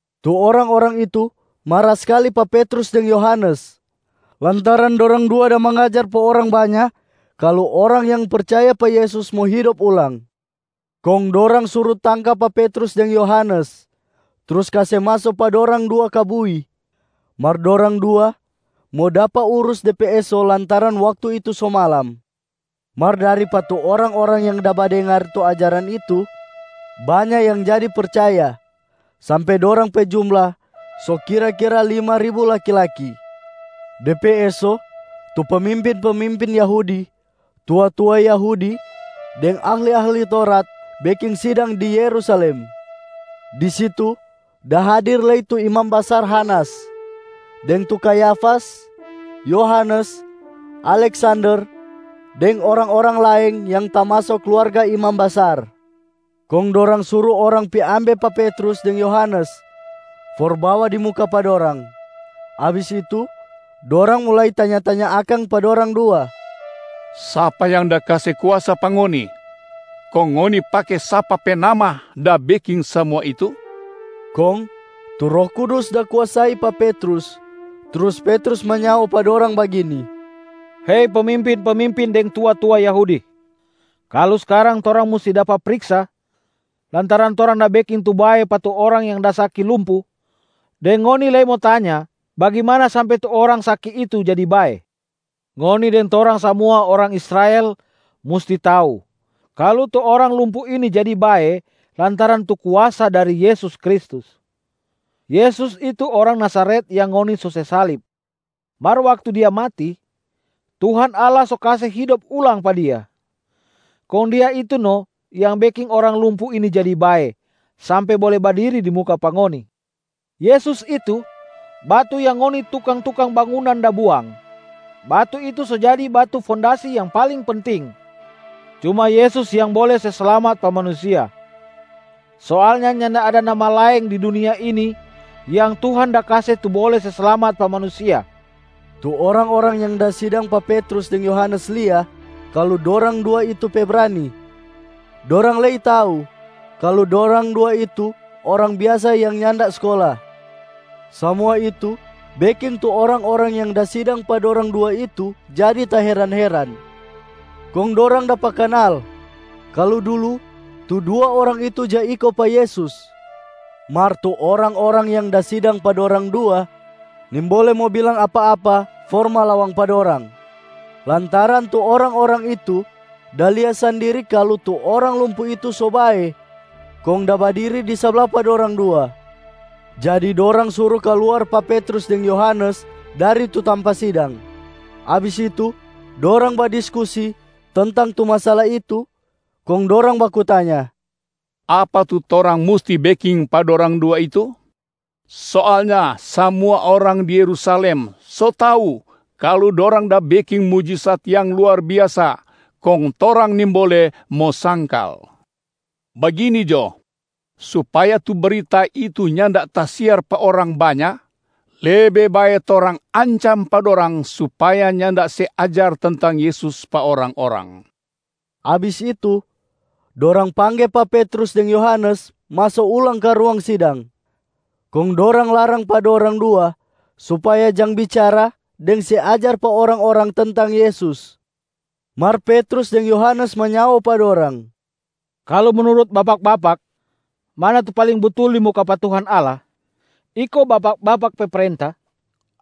Tu orang-orang itu mara skali pa Petrus deng Yohanes lantaran dorang dua da mangajar pa orang banya kalu orang yang percaya pa Yesus mo hidop ulang. Kong dorang suru tangka pa Petrus deng Yohanes, trus kase maso pa dorang dua ka bui, mar dorang dua mo dapa urus de pe eso lantaran waktu itu so malam. Mar dari pa tu orang-orang yang da badengar tu ajaran itu banya yang jadi percaya sampe dorang pe jumla so kira-kira lima ribu laki-laki. De pe eso, tu pemimpin-pemimpin Yahudi, tua-tua Yahudi deng ahli-ahli Taurat beking sidang di Yerusalem. Di situ da hadir lei tu imam basar Hanas, deng tu Kayafas, Yohanes, Aleksander deng orang-orang laeng yang tamaso kluarga imam basar. Kong dorang suru orang pi ambe pa Petrus deng Yohanes for bawa di muka pa dorang. Abis itu dorang mulai tanya-tanya akang pa dorang dua, “Sapa yang da kase kuasa pa ngoni? Kong ngoni pake sapa pe nama da beking samua itu?” Kong tu Roh Kudus da kuasai pa Petrus, trus Petrus manyao pa dorang bagini, “Hei pemimpin-pemimpin deng tua-tua Yahudi. Kalu skarang torang musti dapa priksa lantaran torang da beking tu bae pa tu orang yang da saki lumpu, deng ngoni lei mo tanya bagimana sampe tu orang saki itu jadi bae, ngoni deng torang samua orang Israel musti tau kalu tu orang lumpu ini jadi bae lantaran tu kuasa dari Yesus Kristus. Yesus itu orang Nazaret yang ngoni so se salib. Mar waktu Dia mati, Tuhan Allah so kase hidop ulang pa Dia, kong Dia itu no yang beking orang lumpu ini jadi bae sampe bole badiri di muka pa ngoni. Yesus itu, ‘Batu yang ngoni tukang-tukang bangunan da buang, batu itu so jadi batu fondasi yang paling penting.’ Cuma Yesus yang bole se slamat pa manusia. Soalnya nyanda ada nama laeng di dunia ini yang Tuhan da kase tu bole se slamat pa manusia.” Tu orang-orang yang da sidang pa Petrus deng Yohanes lia kalu dorang dua itu pe brani. Dorang lei tau kalu dorang dua itu orang biasa yang nyanda skola. Samua itu beking tu orang-orang yang da sidang pa dorang dua itu jadi taheran-heran. Kong dorang dapa kanal kalu dulu tu dua orang itu ja iko pa Yesus. Mar tu orang-orang yang da sidang pa dorang dua nimbole mo bilang apa-apa for malawang pa dorang, lantaran tu orang-orang itu da lia sandiri kalu tu orang lumpu itu so bae kong da badiri di sabla pa dorang dua. Jadi dorang suru kaluar pa Petrus deng Yohanes dari tu tampa sidang. Abis itu, dorang badiskusi tentang tu masala itu, kong dorang baku tanya, “Apa tu torang musti beking pa dorang dua itu? Soalnya samua orang di Yerusalem so tau kalu dorang da beking mujisat yang luar biasa kong torang nimbole mo sangkal. Bagini jo, supaya tu brita itu nyanda tasiar pa orang banya, lebe bae torang ancam pa dorang supaya nyanda se ajar tentang Yesus pa orang-orang.” Abis itu, dorang pangge pa Petrus deng Yohanes maso ulang ka ruang sidang. Kong dorang larang pa dorang dua supaya jang bicara deng se ajar pa orang-orang tentang Yesus. Mar Petrus deng Yohanes manyao pa dorang, “Kalu menurut bapak-bapak, mana tu paling butul di muka pa Tuhan Allah? Iko bapak-bapak pe prenta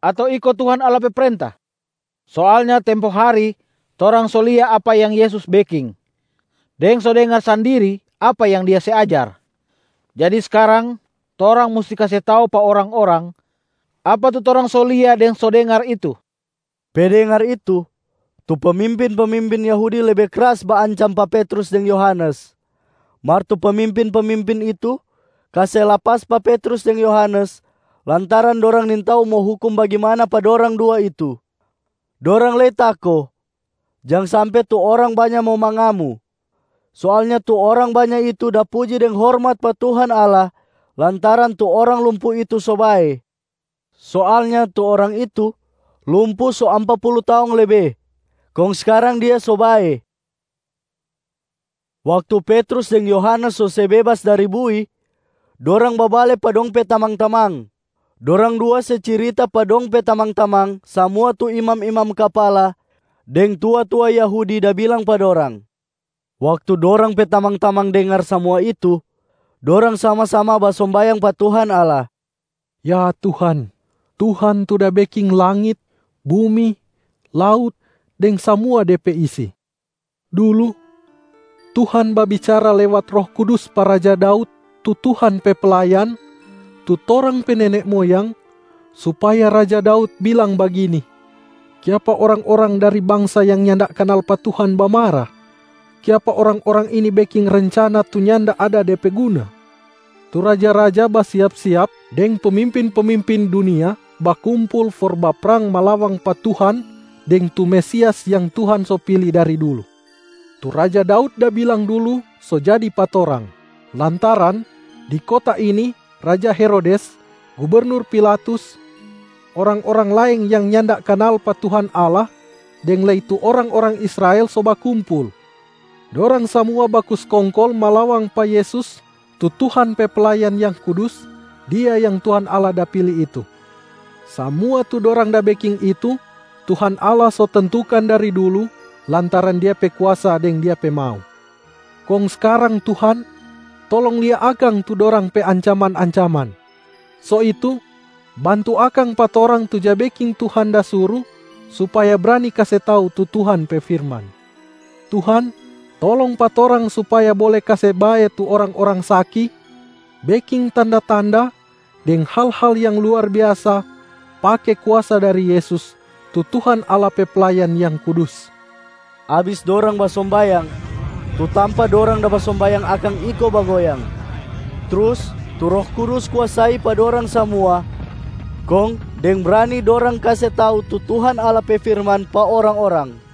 ato iko Tuhan Allah pe prenta? Soalnya tempo hari torang so lia apa yang Yesus beking deng so dengar sandiri apa yang Dia se ajar. Jadi skarang torang musti kase tau pa orang-orang apa tu torang so lia deng so dengar itu.” Pe dengar itu, tu pemimpin-pemimpin Yahudi lebe kras baancam pa Petrus deng Yohanes, mar tu pemimpin-pemimpin itu kase lapas pa Petrus deng Yohanes lantaran dorang nintau mo hukum bagimana pa dorang dua itu. Dorang lei tako jang sampe tu orang banya mo mangamu. Soalnya tu orang banya itu da puji deng hormat pa Tuhan Allah lantaran tu orang lumpu itu so bae. Soalnya tu orang itu lumpu so ampa pulu taong lebe, kong skarang dia so bae. Waktu Petrus deng Yohanes so se bebas dari bui, dorang babale pa dong pe tamang-tamang. Dorang dua se cirita pa dong pe tamang-tamang samua tu imam-imam kapala deng tua-tua Yahudi da bilang pa dorang. Waktu dorang pe tamang-tamang dengar samua itu, dorang sama-sama basombayang pa Tuhan Allah, “Ya Tuhan, Tuhan tu da beking langit, bumi, laut, deng samua de pe isi. Dulu, Tuhan babicara lewat Roh Kudus pa raja Daud tu Tuhan pe playan, tu torang pe nene moyang, supaya raja Daud bilang bagini, Kiapa orang-orang dari bangsa yang nyanda kanal pa Tuhan bamara? Kiapa orang-orang ini beking rencana tu nyanda ada de pe guna? Tu raja-raja basiap-siap deng pemimpin-pemimpin dunia bakumpul for baprang malawang pa Tuhan deng tu Mesias yang Tuhan so pili dari dulu. Tu raja Daud da bilang dulu so jadi pa torang, lantaran di kota ini raja Herodes, gubernur Pilatus, orang-orang laeng yang nyanda kanal pa Tuhan Allah deng lei tu orang-orang Israel so bakumpul. Dorang samua baku skongkol malawang pa Yesus tu Tuhan pe Playan yang kudus, Dia yang Tuhan Allah da pili itu. Samua tu dorang da beking itu Tuhan Allah so tentukan dari dulu lantaran Dia pe kuasa deng Dia pe mau. Kong skarang Tuhan, tolong lia akang tu dorang pe ancaman-ancaman. So itu, bantu akang pa torang tu ja beking Tuhan da suru supaya brani kase tau tu Tuhan pe firman. Tuhan tolong pa torang supaya bole kase bae tu orang-orang saki, beking tanda-tanda deng hal-hal yang luar biasa pake kuasa dari Yesus, tu Tuhan Allah pe Playan yang kudus.” Abis dorang basombayang, tu tampa dorang da basombayang akang iko bagoyang. Trus tu Roh Kudus kuasai pa dorang samua kong deng brani dorang kase tau tu Tuhan Allah pe firman pa orang-orang.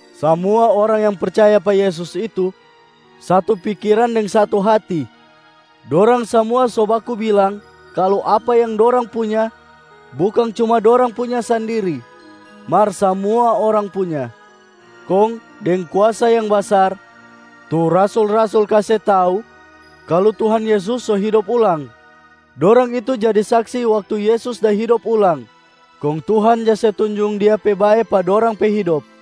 Samua orang yang percaya pa Yesus itu satu pikiran deng satu hati. Dorang samua so baku bilang kalu apa yang dorang punya bukang cuma dorang punya sandiri, mar samua orang punya. Kong deng kuasa yang basar tu rasul-rasul kase tau kalu Tuhan Yesus so hidop ulang, dorang itu jadi saksi waktu Yesus da hidop ulang. Kong Tuhan ja se tunjung Dia pe bae pa dorang pe hidop.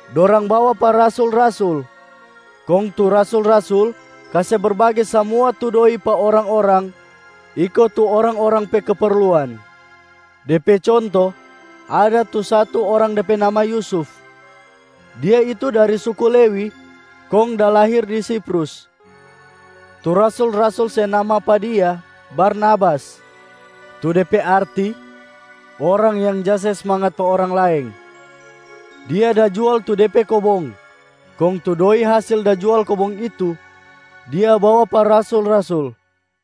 dorang bawa pa rasul-rasul, kong tu rasul-rasul kase berbage samua tu doi pa orang-orang iko tu orang-orang pe keperluan. De pe conto, ada tu satu orang de pe nama Yusuf. Dia itu dari suku Lewi kong da lahir di Siprus. Tu rasul-rasul se nama pa dia Barnabas, tu de pe arti orang yang ja se smangat pa orang laeng. Dia da jual tu de pe kobong kong tu doi hasil da jual kobong itu, dia bawa pa rasul-rasul.